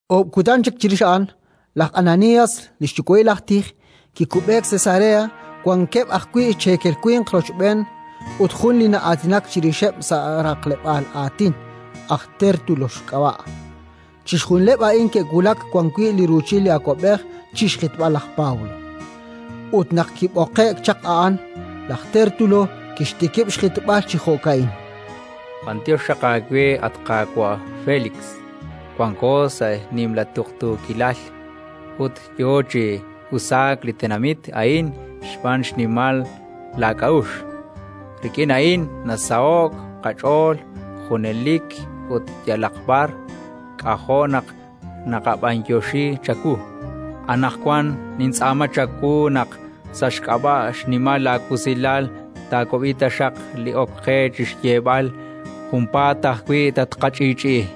Oob' kutan chik chirix a'an, laj Ananías, li xyuwa'il aj tij, kikub'eek Cesarea, wankeb' ajwi' cheekel winq rochb'een ut jun li na'aatinak chirixeb' sa' raqleb'aal aatin, aj Tértulo xk'ab'a'. Chixjunileb' a'an ke'wulak wan wi' li ruuchil li awab'ej chi xjitb'al laj Pablo, ut naq kib'oqe'k chaq a'an, laj Tértulo kixtikib' xjitb'al chi jo'ka'in: —B'anyox xaq aawe, at qaawa' Félix, wanko sa' nimla tuqtuukilal ut yo chi usaak li tenamit a'in xb'aan xnimal laak'a'uxl. Rik'in a'in nasaho'k qach'ool junelik ut yalaq b'ar; k'ajo' naq naqab'anyoxi chawu. Anaqwan nintz'aama chawu naq, sa' xk'ab'a' xnimal laawusilal, taawab'i taxaq li ok qe chi xyeeb'al. Junpaat ajwi' tatqach'i'ch'i'i.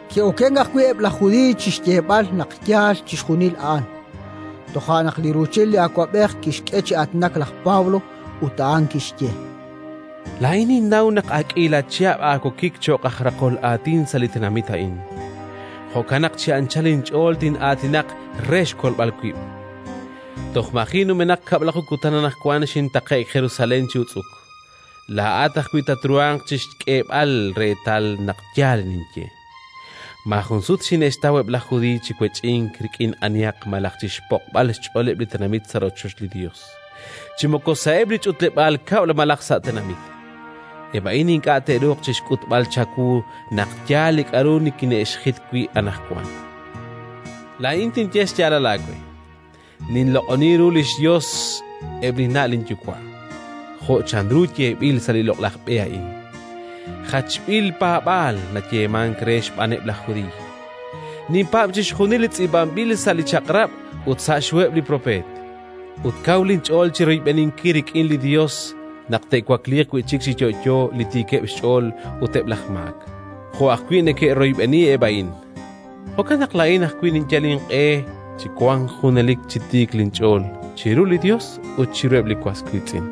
Ke'okenk ajwi' eb' laj Judiiy chi xyeeb'al naq yaal chixjunil a'an. Toja' naq li ruuchil li awab'ej kixk'e chi aatinak laj Pablo ut a'an kixye: —Laa'in ninnaw naq ak k'iila chihab' aawokik cho'q aj raqol aatin sa' li tenamit a'in; jo'kan naq chi anchal inch'ool tin'aatinaq re xkolb'al wib'. Toj maji' numenaq kab'laju kutan anaqwan xintaqe'k Jerusalén chi utz'uk: laa'at ajwi' tatruhanq chi xk'eeb'al reetal naq yaal li ninye. Maajun sut xine'xtaw eb' laj Judiiy chi wech'ink rik'in anihaq malaj chi xpo'b'al xch'ooleb' li tenamit sa' rochoch li Yos, chi moko sa'eb' li ch'utleb'aal kab'l malaj sa' junaq chik na'ajej sa' li tenamit. Eb' a'in ink'a' te'ruuq chi xk'utb'al chawu naq yaal li k'aru nikine'xjit wi' anaqwan. Laa'in tinye xyaalal aawe: ninloq'oni ru li xYos eb' linna' linyuwa' jo' chanru yeeb'il sa' li loq'laj B'e a'in, «jachb'il paab'aal» nayeemank re xb'aaneb' laj Judiiy. Ninpaab' chixjunil li tz'iib'anb'il sa' li Chaq'rab' ut sa' xHuheb' li Propeet, ut kaw linch'ool chi royb'eninkil rik'in li Yos naq te'wakliiq wi' chik chi yo'yo li tiikeb' xch'ool ut eb' laj maak, jo' ajwi' neke'royb'eni eb' a'in. Jo'kan naq laa'in ajwi' ninyal inq'e chi wank junelik chi tiik linch'ool chiru li Yos ut chiruheb' li was wiitz'in.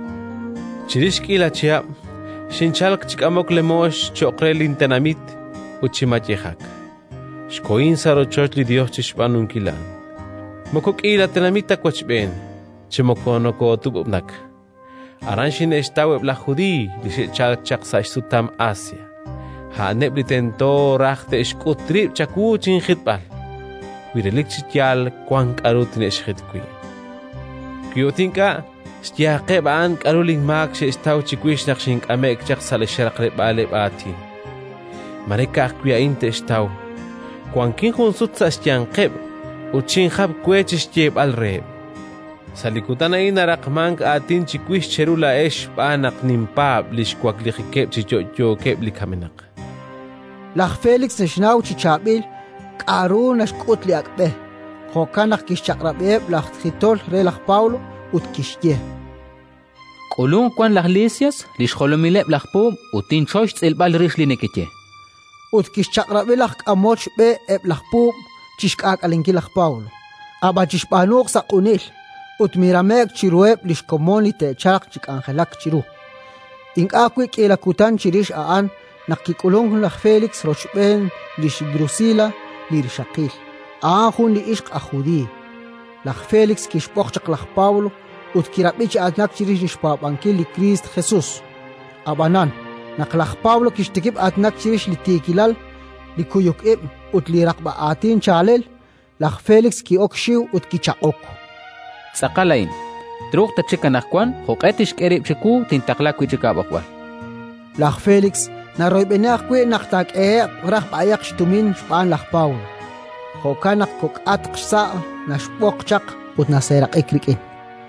“Chirix k'iila chihab', xinchalk chi k'amok lemoox cho'q re lintenamit ut chi mayejak. Xkohin sa' rochoch li Yos chi xb'aanunkil a'an. Moko k'iila tenamit ta wochb'een, chi moko nokootub'ub'nak. Aran xine'xtaw eb' laj Judiiy li xe'chalk chaq sa' xsutam Asia: a'aneb' li tento raj te'xk'ut rib' chawu chinjitb'al, wi relik chi yaal wank k'aru tine'xjit wi'. Wi ut ink'a', xyeeqeb' a'an k'aru linmaak xe'xtaw chiwix naq xink'ame'k sa' li xraqleb'aaleb' aatin. Mare ka'ajwi' a'in te'xtaw: wankin jun sut sa' xyanqeb' ut xinjap we chi xyeeb'al reheb': «Sa' li kutan a'in naraqmank aatin chiwix cheru laa'ex xb'aan naq ninpaab' li xwaklijikeb' chi yo'yo eb' li kamenaq»”. Laj Félix naxnaw chi chaab'il k'aru naxk'ut li Ak' B'e; jo'kan naq kixchaq'rab'iheb' laj jitol re laj Pablo ut kixye: —K'ulunq wan laj Lisias, li xjolomileb' laj puub', ut tinchoy xtz'ilb'al rix li nekeye. Ut kixchaq'rab'i laj k'amol xb'e eb' laj puub' chi xk'aak'alenkil laj Pablo, ab'an chixb'aanuuq sa' q'unil, ut mirame'k chiruheb' li xkomon li te'chalq chi k'anjelak chiru. Ink'a' ajwi' k'iila kutan chirix a'an naq kik'ulunk wi' chik laj Félix rochb'een lix Drusila li rixaqil, a'an jun li ixq aj Judiiy. Laj Félix kixb'oq chaq laj Pablo ut kirab'i chi aatinak chirix li xpaab'ankil li Kristo Jesus. Ab'anan, naq laj Pablo kixtikib' aatinak chirix li tiikilal, li kuyuk ib' ut li raqb'a aatin chaalel, laj Félix ki'ok xxiw ut kichaq'ok: —Tz'aqal a'in; truuq tatxik anaqwan. Jo'q'e tixk'e rib' chiwu, tintaqla wi' chik aab'oqb'al, chan. Laj Félix naroyb'eni ajwi' naq taak'ehe'q raj b'ayaq xtumin xb'aan laj Pablo: jo'kan naq kok'aq xsa' naxb'oq chaq ut naseeraq'ik rik'in.